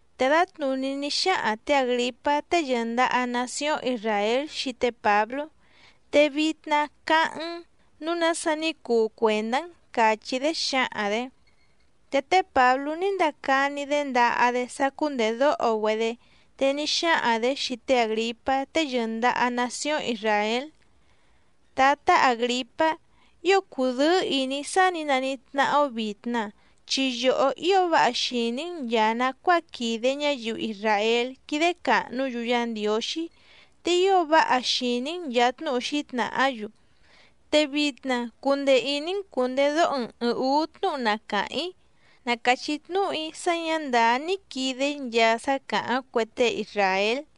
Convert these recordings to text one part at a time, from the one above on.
Te dǎtnùní ní xáhaⁿ tě Àgripá tée yɨ̀ndaha nacióⁿ Isràél xii té Pǎblú: —Te vitna cáháⁿ‑n nǔu nása ní cuu cuèndá‑n —càchí‑dé xǎhaⁿ‑dě. Te té Pǎblú ní ndacani‑dé ndaha‑dé sá cúndèdóho‑güedé, te ní xáhaⁿ‑dě xii té Àgripá tée yɨ̀ndaha nacióⁿ Isràél: —Tǎtá Àgripá, ío cùdɨ́ɨ́ ìní‑í sá nǐ naníhí tnáhá‑ó vìtna, chi yòhó ío váha xìní‑n nchàa nacuáa quìde ñáyiu isràél quídé càhnú‑yu Yá Ndiǒxí, te ío váha xìní‑n nchàa tnúhu xǐtnàhá‑yu. Te vitna cundee ìní‑n cùndedóho‑n ɨ̀ɨⁿ úú tnúhu na càháⁿ‑í. Na càchí tnúhu‑í sá ñǎ ndàá ní quìde‑í nchaa sá càháⁿ cue tée isràél.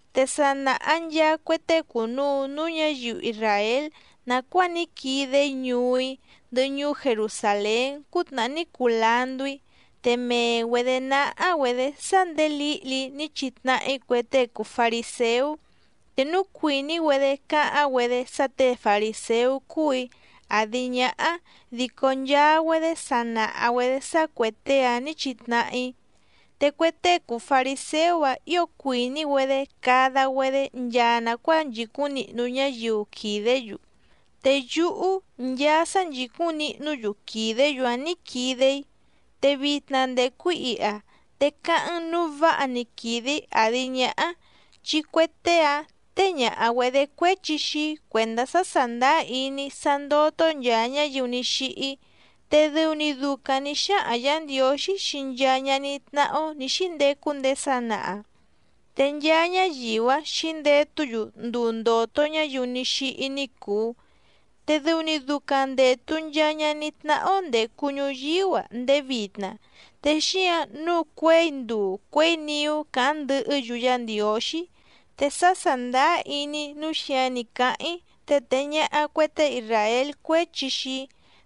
’Te sa nàha nchaa cue tée cùnuu núú ñǎyiu isràél nàcuáa ní quide‑í ñuú‑í ndɨhɨ ñuú Jerusàlén cútnàhá ní cuu landú‑í. Te mee‑güedě náhá‑güedě sá ndèé lǐhli‑í ní chitnahá‑í cue tée cùu fariséú. Te núu cuìní‑güedé cáháⁿ‑güedé sá těe farìséú cúù‑í àdi ñáhá dico nchaa‑güedé sa nàha‑güedé sá cuè tée‑áⁿ nǐ chitnahá‑í. Te cue tée cùu fariséú‑áⁿ ǐo cuìní‑güedé cada‑güedé nchaa nàcuáa nchìcúⁿ nihnu ñáyiu quìdé‑yu. Te yúhú nchaa sá nchìcúⁿ nihnú‑yu quìdé‑yu‑áⁿ nǐ quide‑í. Te vitna ndècu‑í iha, te cáháⁿ‑n nǔu váha‑ni quìde‑í àdi ñáhá, chi cue tée‑ǎⁿ téé ñàha‑güedé cuéchi xii‑í cuèndá sá sàndáá iní‑í sá ndótó nchàa ñáyiu ní xíhí. Te dɨu‑ni ducaⁿ nǐ xáhaⁿ Yǎ Ndiǒxí xii nchaa ñaní tnáhá‑ó nǐ xíndecu ndéé sanaha. Te nchaa ñáyiu‑áⁿ xǐndetú‑yu nduu ndòto ñáyiu ní xíhí ní cùu. Te dɨu‑ni ducaⁿ ndètu nchaa ñaní tnáhá‑ó ndècu ñuyíú‑a ndéé vitna, te xíǎⁿ nǔu cuěi nduu cuěi niú càháⁿ ndɨhɨ́‑yu Yá Ndiǒxí. Te sá sàndáá iní‑í nǔu xíǎⁿ ní cáháⁿ‑í, te tèe ñaha cue tée isràél cuéchi xii‑í.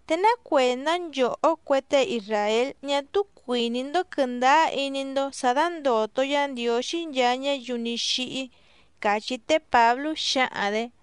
¿Te ná cuèndá nchòhó cue tée isràél ñá túú cuìní‑ndó quɨ̀ndáá iní‑ndó sǎ dándòto Yá Ndiǒxí nchaa ñáyiu ní xíhí? —càchí té Pǎblú xǎhaⁿ‑dě.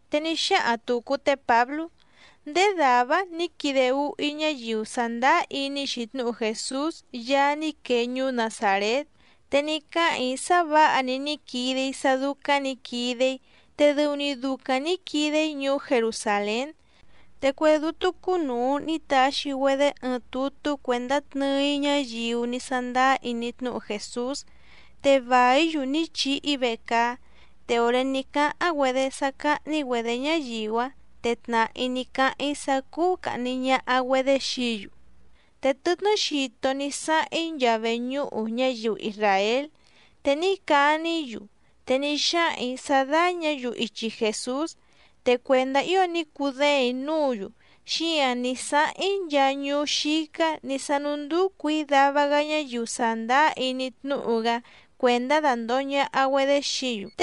Te ní xáhaⁿ tùcu té Pǎblú: —Ndéé dàvá‑áⁿ nǐ quide úhú‑í ñáyiu sàndáá iní‑xi tnúhu Jèsús Yaá ní quee ñuú Nazàrét, te ní cáhàⁿ‑í sá vǎha‑ni ní quide‑í sá dúcáⁿ nǐ quide‑í. Te dɨu‑ni ducaⁿ nǐ quide‑í ñuú Jerusàlén. Te cue dútú cúnùu ní taxi‑güedé ɨɨⁿ tutú cuèndá tnɨɨ‑í ñáyiu ní sándáá iní tnúhu Jèsús, te vàí‑yu ní chihi‑í vecaá. Te òré ní cáháⁿ‑güedé sá cáhní‑güedě ñáyiu‑áⁿ, te tnàhá‑í ní cáháⁿ‑í sá cúú càhni ñaha‑güedé xií‑yu. Te tɨtnɨ́ xito ní sáháⁿ‑í nchaa veñúhu ñáyiu isràél, te ní cani‑í‑yu te ní xáhaⁿ‑ǐ sá dáñǎ‑yu ichi Jèsús. Te cuèndá ío ní cudéèⁿ‑í núǔ‑yu, xíǎⁿ ní sáháⁿ‑í nchaa ñuú xícá nǐ sánúndúcù‑í dava‑gá ñáyiu sàndáá iní tnúhu‑gá cuèndá dandòho ñaha‑güedé xií‑yu.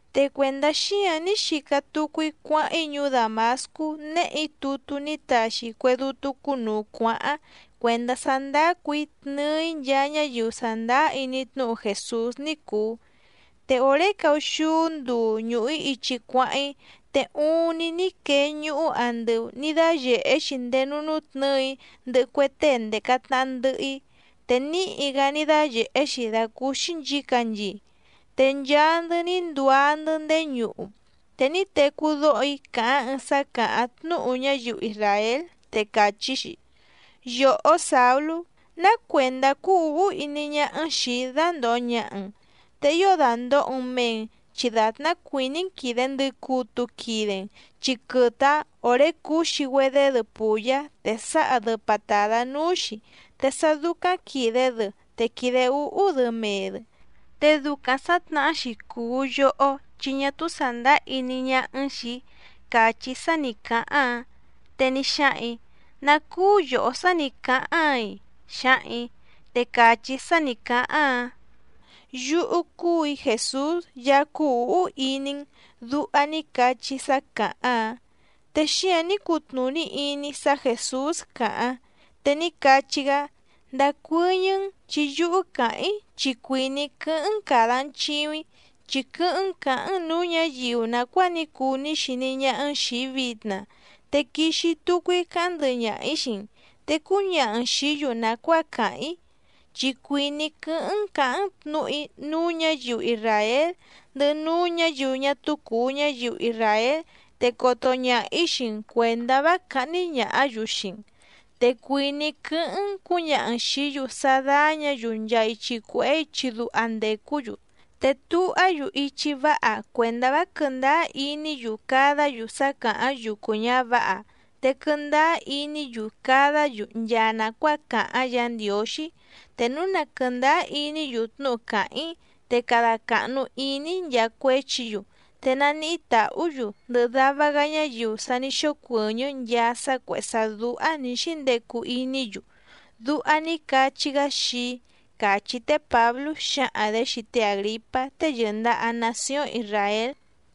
’Te cuèndá xíǎⁿ ní xica tucu‑í cuáháⁿ‑í ñuú Dàmascú, néhè‑í tutú ní taxi cue dútú cúnùu cuáháⁿ, cuèndá sá ndácù‑í tnɨɨ‑í nchaa ñáyiu sàndáá iní tnúhu Jèsús ní cùu. Te òré caúxúú nduu ñùhu‑í ichi cuáháⁿ‑í, te uuⁿni ní quee ñuhú andɨu nǐ dáyèhé‑xi ndéé núú nútnɨ̌ɨ‑í ndɨhɨ cue tée ndèca tnaha ndɨhɨ‑í, te níhi‑gá ní dáyèhé‑xi dàcúúxí nchǐcanchii. Te nchaa‑ndɨ́ ní nduá‑ndɨ́ ndéé ñuhu, te ní tecú dóho‑í càháⁿ ɨɨⁿ sá càháⁿ tnúhu ñáyiu isràél, te càchí‑xi: “Yòhó Sàulú, ¿Ná cuèndá cúú ǔhú iní ñáhá‑n xìi‑í dándòho ñaha‑n? Te ío dàndoho‑n mee‑n, chi dàtná cuìní‑n quìde ndɨcutu quide‑n chi quɨtɨ‑áⁿ òré cǔxi‑güedé‑dɨ pùyá te sǎha‑dɨ patàdá núú‑xi, te sá dúcáⁿ quìde‑dɨ te quìde úhú‑dɨ mee‑dɨ. Te ducaⁿ sǎtnahá‑xi cùu yohó chi ñá túú sàndáá iní ñáhá‑n xìi‑í”, càchí sá nǐ cáháⁿ‑áⁿ. Te ní xáhaⁿ‑ǐ: “¿Ná cúú yòhó sá nǐ cáháⁿ‑áiⁿ?”, xǎhaⁿ‑ǐ. Te càchí sá càháⁿ‑áⁿ: “Yúhú cúù‑í Jèsús Yaá cúú ǔhú iní‑n”, duha ní cachí sá càháⁿ‑áⁿ. Te xíǎⁿ ní cutnùní iní‑í sá Jèsús càháⁿ. Te ní cachí‑gá: “Ndacuɨ́ñɨ́‑n chi yúhú càháⁿ‑í chi cuìní‑í quɨ́hɨ́ⁿ‑n càda‑n chiuⁿ‑í, chi quɨ́hɨ́ⁿ‑n cǎháⁿ‑n nǔú ñǎyiu nàcuáa ní cuu ní xiní ñáhá‑n xìi‑í vitna, te quixi tucu‑í cáháⁿ ndɨhɨ ñaha‑ǐ xii‑n, te cúñaha‑n xìí‑yu nàcuáa cáháⁿ‑í. Chi cuìní‑í quɨ́hɨ́ⁿ‑n cǎháⁿ‑n tnǔhu‑í núú ñǎyiu isràél ndɨhɨ núú ñǎyiu ñá túú cùu ñáyiu isràél, te coto ñaha‑ǐ xii‑n cuèndá vá cáhní ñàhá‑yu xii‑n. Te cuìní‑í quɨ́hɨ́ⁿ‑n cǔñaha‑n xìí‑yu sá dáñǎ‑yu nchaa ichi cuèhé ichi duha ndècú‑yu, te tuhá‑yu ichi váha cuèndá vá quɨ̀ndáá iní‑yu cadá‑yu sá càháⁿ yucu ñǎvǎha, te quɨndáá iní‑yu cadá‑yu nchaa nàcuáa càháⁿ Yǎ Ndiǒxí. Te núu na quɨ̀ndáá iní‑yu tnúhu càháⁿ‑í, te cada càhnu iní‑í nchaa cuéchi‑yu, te naníhí tàhú‑yu ndɨhɨ dava‑gá ñáyiu sa ní xócuɨ̀ñɨ́ nchaa sá cuèhé sá dúhá nǐ xíndecu iní‑yu”, duha ní cachí‑gá xii‑í —càchí té Pǎblú xǎhaⁿ‑dě xii té Àgripá tée yɨ̀ndaha nacióⁿ Isràél.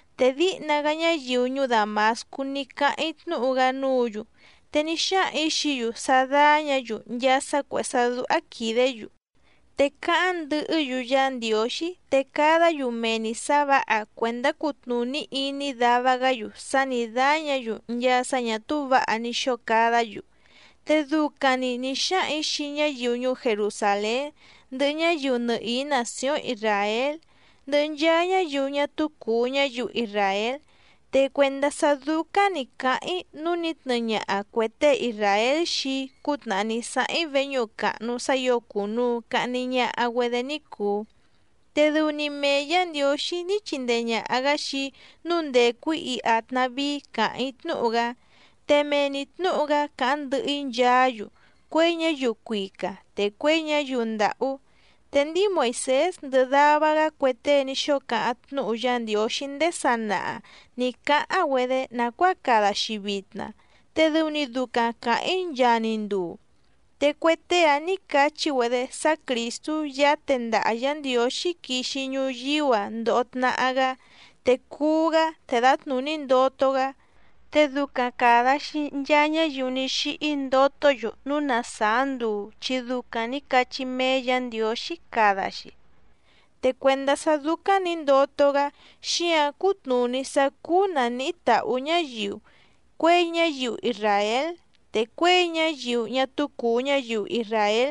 Te díhna‑gá ñáyiu ñuú Dàmascú ní cáháⁿ‑í tnúhu‑gá núǔ‑yu, te ní xáhaⁿ‑ǐ xií‑yu sá dáñǎ‑yu nchaa sá cuèhé sá dúhá quìdé‑yu, te cáháⁿ ndɨhɨ́‑yu Yá Ndiǒxí, te cadá‑yu mee‑ni sǎ vǎha cuèndá cutnùní iní dava‑gá‑yu sá nǐ dáñǎ‑yu nchaa sá ñà túú vǎha ní xóo cadá‑yu. Te ducaⁿ‑ni nì xáhaⁿ‑ǐ xii ñáyiu ñuú Jerusàlén ndɨhɨ ñáyiu nɨhìí nàcióⁿ Isràél ndɨhɨ nchaa ñáyiu ñá túú cùu ñáyiu isràél. Te cuèndá sá dúcáⁿ nǐ cáháⁿ‑í nǔu ní tnɨɨ ñaha cuè tée isràél xii‑í cútnàhá ní sáháⁿ‑í veñúhu càhnu sá ǐo cùnuu cahni ñaha‑güedé ní cùu. Te dɨu‑ni mee Yǎ Ndiǒxí ní chindee ñàha‑gá xii‑í nǔu ndècu‑í iha tnàvíí càháⁿ‑í tnúhu‑gá, te mee‑ni tnǔhu‑gá càháⁿ ndɨhɨ‑í nchaá‑yu, cuěi ñáyiu cuica, te cuěi ñáyiu ndàhú. Te ndíi Moìsés ndɨhɨ dava‑gá cue tée ní xóo cáháⁿ tnúhu Yá Ndiǒxí ndéé sanaha nǐ cáháⁿ‑güedé nàcuáa cada‑xi vitna, te dɨu‑ni ducaⁿ càháⁿ‑í nchaa‑ni nduu. Te cue tée‑áⁿ nǐ cachí‑güedé sá Crìstú Yaá tendaha Yǎ Ndiǒxí quixi ñuyíú‑a ndoho tnahá‑gá, te cuú‑gá, te dǎtnùní ndoto‑gá. Te ducaⁿ càda‑xi nchaa ñáyiu ní xíhí ndotó‑yu núu na sàá nduu chi ducaⁿ càda‑xi ní cachí méé Yǎ Ndiǒxí. Te cuèndá sá dúcáⁿ nǐ ndoto‑gá, xíǎⁿ cútnùní sá cúú nàníhí tàhú ñáyiu, cuěi ñáyiu isràél, te cuěi ñáyiu ñá túú cùu ñáyiu isràél.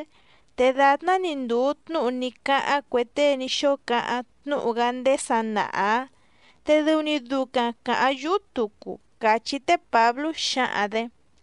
Te dàtná‑ni ndùu tnúhu ní cáháⁿ cue tée ní xóo cáháⁿ tnúhu‑gá ndéé sanaha‑ǎⁿ, te dɨu‑ni ducaⁿ càháⁿ yúhú tucu —càchí té Pǎblú xǎhaⁿ‑dě.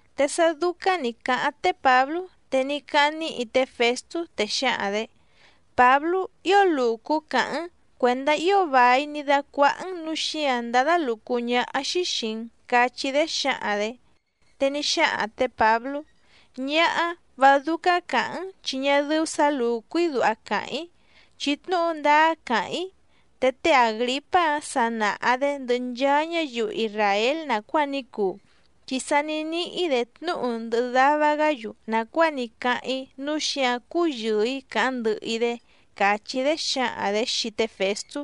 Te sá dúcáⁿ nǐ cáháⁿ té Pǎblú, te ní cáháⁿ níhi té Fèstú, te xǎhaⁿ‑dě: —Pǎblú, ¡ío lùcú càháⁿ‑n! Cuèndá ío vài ní dácuáhá‑n, núu xíǎⁿ ndádá lùcú ñáhá‑xí xìi‑n —cachí‑dé xǎhaⁿ‑dě. Te ní xáhaⁿ tě Pǎblú: —Ñáhá, vá dúcáⁿ cǎháⁿ‑n chi ñá dɨ́ú sǎ lùcú‑í duha càháⁿ‑í, chi tnúhu ndáá càháⁿ‑í. Te té Àgripá‑a sa nàha‑dé ndɨhɨ nchaa ñáyiu isràél nàcuáa ní cuu, chi sa ní níhí‑dě tnúhu ndɨhɨ dava‑gá‑yu nàcuáa ní cáháⁿ‑í, núu xíǎⁿ cúyɨ̀ɨ‑í càháⁿ ndɨhɨ‑í‑dé —càchí‑dé xǎhaⁿ‑dě xii té Fèstú.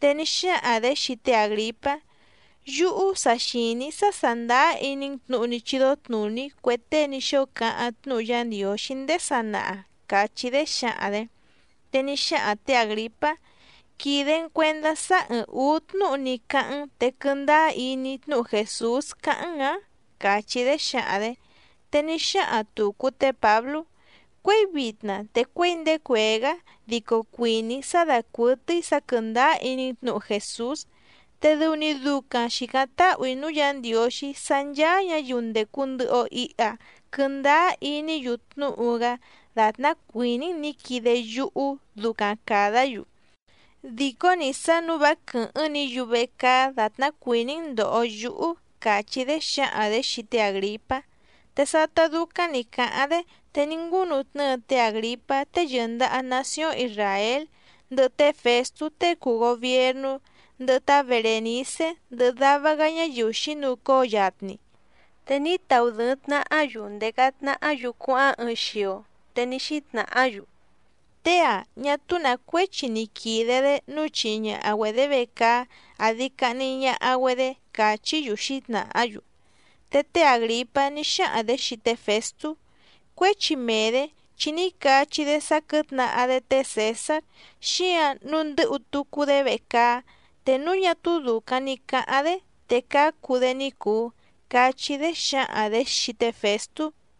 Te ní xáhaⁿ‑dě xii té Àgripá: —Yúhú sa xìní‑í sá sàndáá iní‑n tnǔhu ní chídó tnùní cue tée ní xóo cáháⁿ tnúhu Yá Ndiǒxí ndéé sanaha —càchí‑dé xǎhaⁿ‑dě. Te ní xáhaⁿ tě Àgripá: —¿Quìde‑n cuendá sá ɨ́ɨ́ⁿ ǔú tnúhu ní cáháⁿ‑n te quɨndáá iní‑í tnúhu Jèsús cáháⁿ‑n‑ǎⁿ? —càchí‑dé xǎhaⁿ‑dě. Te ní xáhaⁿ tùcu té Pǎblú: —Cuěi vitna te cuěi ndéé cuèé‑gá dico cuìní‑í sá dàcuɨtɨ́í sǎ quɨ̀ndáá iní‑n tnǔhu Jèsús. Te dɨu‑ni ducaⁿ xìcáⁿ táhù‑í núú Yǎ Ndiǒxí sá ncháá ñǎyiu ndècu ndɨhɨ‑o iha quɨndáá iní‑yu tnúhu‑gá dàtná cuìní‑n nǐ quide yúhú, ducaⁿ càdá‑yu. Dìcó‑ni sá nǔu vá quɨ̀hɨ́ⁿ‑ni‑yu vecaá dàtná cuìní‑n ndòho yúhú —càchí‑dé xǎhaⁿ‑dě xii té Àgripá. Te sátá dúcáⁿ nǐ cáháⁿ‑dé, te ní ngúnutnɨ́ɨ té Àgripá tée yɨ̀ndaha nacióⁿ Isràél, ndɨhɨ té Fèstú tée cùu gobiernú, ndɨhɨ tá Berènicé ndɨhɨ dava‑gá ñáyiu xǐnucóo yatni. Te ní tnahá‑yu ndèca tnahá‑yu cuáháⁿ ɨɨⁿ xio. Te ní xítnàhá‑yu: —Tée‑ǎⁿ ñá túú nǎ cuéchi ni quìde‑dé nǔu chihi ñaha‑güedě vecaá àdi cahni ñaha‑güedé —càchí‑yu xǐtnàhá‑yu. Te té Àgripá ní xáhaⁿ‑dě xii té Fèstú: —Cuéchi mee‑dě chi ní cachí‑dé sá quɨ̌tnahá‑dé té Cèsár, xíǎⁿ nǔu ndɨ́hu tucu‑dé vecaá, te núu ñá túú dùcaⁿ ni cáháⁿ‑dé, te cácu‑dé ní cùu —cachí‑dé xǎhaⁿ‑dě xii té Fèstú.